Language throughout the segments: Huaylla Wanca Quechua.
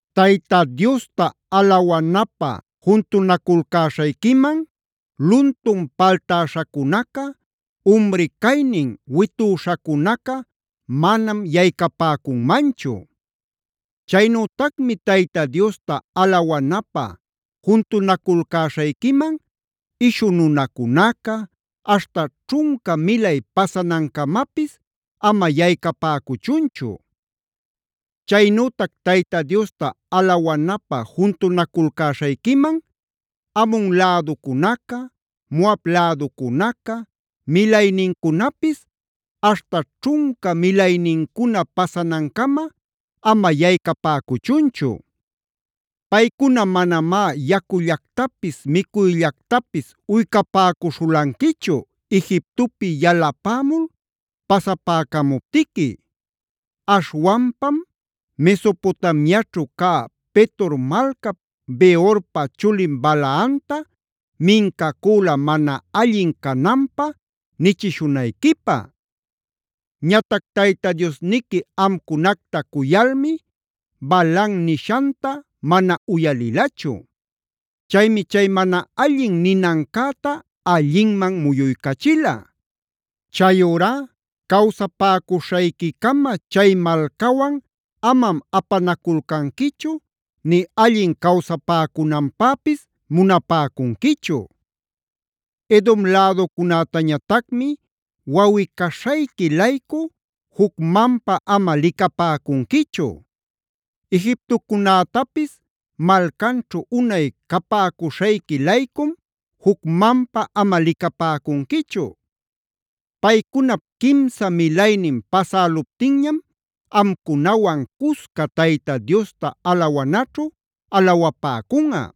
Tayta Diosta alawanapä juntunaculcäśhayquiman luntun paltäśhacunaca, umri caynin witüśhacunaca manam yaycapäcunmanchu. “Chaynütacmi Tayta Diosta alawanapä juntunaculcäśhayquiman ishu nunacunaca, aśhta ćhunca milay pasanancamapis ama yaycapäcuchunchu. “Chaynütac Tayta Diosta alawanapä juntunaculcäśhayquiman Amon läducunaca, Moab läducunaca, milaynincunapis aśhta ćhunca milaynincuna pasanancama ama yaycapäcuchunchu. Paycuna manamá yacullactapis micuyllactapis uycapäcuśhulanquichu Egiptopi yalapämul pasapäcamuptiqui. Aśhwanpam Mesopotamiaćhu cä Petor malcap Beorpa chulin Balaamta mincacüla mana allin cananpä nichishunayquipä. Ñatac Tayta Diosniqui amcunacta cuyalmi Balaam nishanta mana uyalilachu. Chaymi chay mana allin ninancäta allinman muyuycachila. Chayurá cawsapäcuśhayquicama chay malcawan amam apanaculcanquichu nï allin cawsapäcunanpäpis munapäcunquichu. “Edom läducunätañatacmi wawꞌi-caśhayqui-laycu jucmanpa ama licapäcunquichu. Egiptocunätapis malcanćhu unay capäcuśhayqui-laycum jucmanpa ama licapäcunquichu. Paycunap quimsa milaynin pasäluptinñam amcunawan cusca Tayta Diosta alawanaćhu alawapäcunꞌa.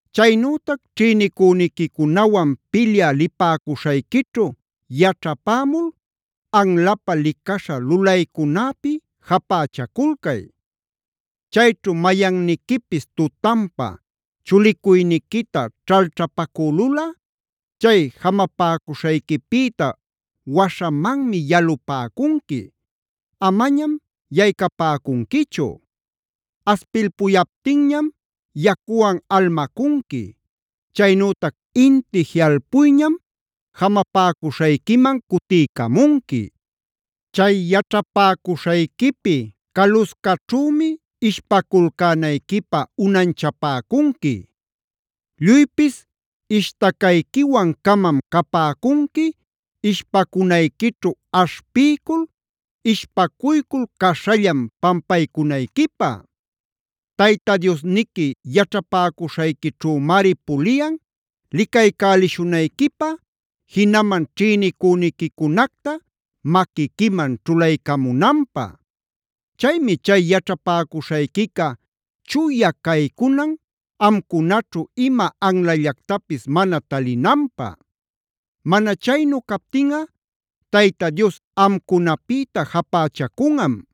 “Chaynütac ćhïnicüniquicunawan pilyä lipäcuśhayquićhu yaćhapämul anlapä licaśha lulaycunäpi japächaculcay. Chayćhu mayanniquipis tutanpä chulicuyniquita ćhalćhapacülulꞌa chay jamapäcuśhayquipïta waśhamanmi yalupäcunqui; amañam yaycapäcunquichu. Aspilpuyaptinñam yacuwan almacunqui; chaynütac inti jiꞌalpuyñam jamapäcuśhayquiman cutiycamunqui. “Chay yaćhapäcuśhayquipi caluscaćhümi ishpaculcänayquipä unanchapäcunqui. Lluypis ishtacayquiwan-camam capäcunqui ishpacunayquićhu aśhpiycul, ishpacuycul caśhallan pampaycunayquipä. Tayta Diosniqui yaćhapäcuśhayquićhümari puliyan licaycälishunayquipä jinaman ćhïnicüniquicunacta maquiquiman ćhulaycamunanpä. Chaymi chay yaćhapäcuśhayquica chuya caycunan amcunaćhu ima anlallactapis mana talinanpä. Mana chaynu captinꞌa Tayta Dios amcunapïta japächacunꞌam.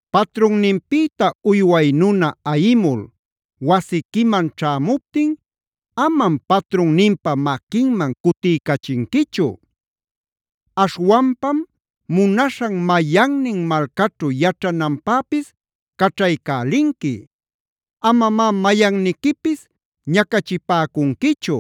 “Patrunninpïta uyway nunaa ayimul wasiquiman ćhämuptin amam patrunninpa maquinman cutiycachinquichu. Aśhwanpam munaśhan mayannin malcaćhu yaćhananpäpis caćhaycälinqui. Amamá mayanniquipis ñacachipäcunquichu.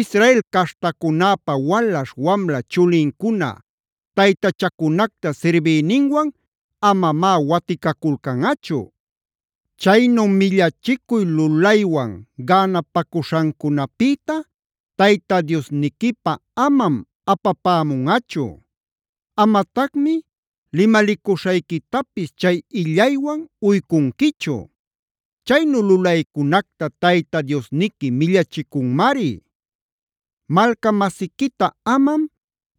“Israel caśhtacunäpa walaśh wamla chulincuna taytachacunacta sirbïninwan amamá waticaculcanꞌachu. Chaynu millachicuy lulaywan gänapacuśhancunapïta Tayta Diosniquipä amam apapämunꞌachu. Amatacmi limalicuśhayquitapis chay illaywan uycunquichu. Chaynu lulaycunacta Tayta Diosniqui millachicunmari. “Malca-masiquita amam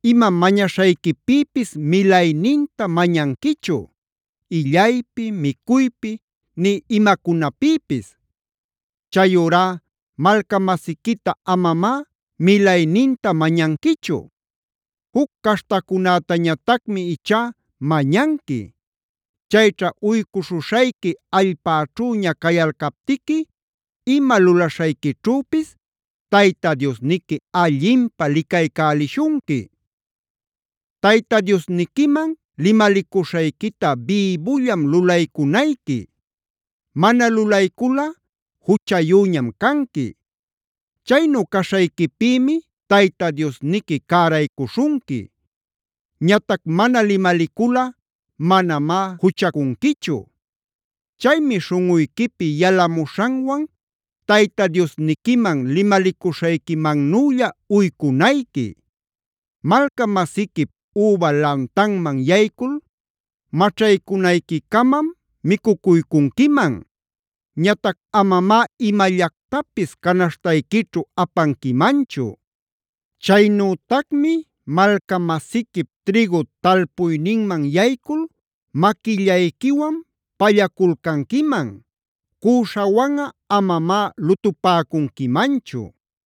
ima mañaśhayquipïpis milayninta mañanquichu: Illaypi, micuypi nï imacunapïpis. Chayurá malca-masiquita amamá milayninta mañanquichu. Juc caśhtacunätañatacmi ichá mañanqui. Chayćha uycuśhuśhayqui allpäćhüña cayalcaptiqui ima lulaśhayquićhüpis Tayta Diosniqui allinpä licaycälishunqui. Tayta Diosniquiman limalicuśhayquita bïbullam lulaycunayqui. Mana lulayculꞌa juchayüñam canqui. Chaynu caśhayquipïmi Tayta Diosniqui cäraycuśhunqui. Ñatac mana limaliculꞌa manamá juchacunquichu. Chaymi śhunꞌuyquipi yalamuśhanwan Tayta Diosniquiman limalicuśhayquimannülla uycunayqui. “Malca-masiquip üba lantanman yaycul maćhaycunayquicamam micucuycunquiman. Ñatac amamá imallactapis canaśhtayquićhu apanquimanchu. Chaynütacmi malca-masiquip trïgu talpuyninman yaycul maquillayquiwan pallaculcanquiman. Cüśhawanꞌa amamá lutupäcunquimanchu.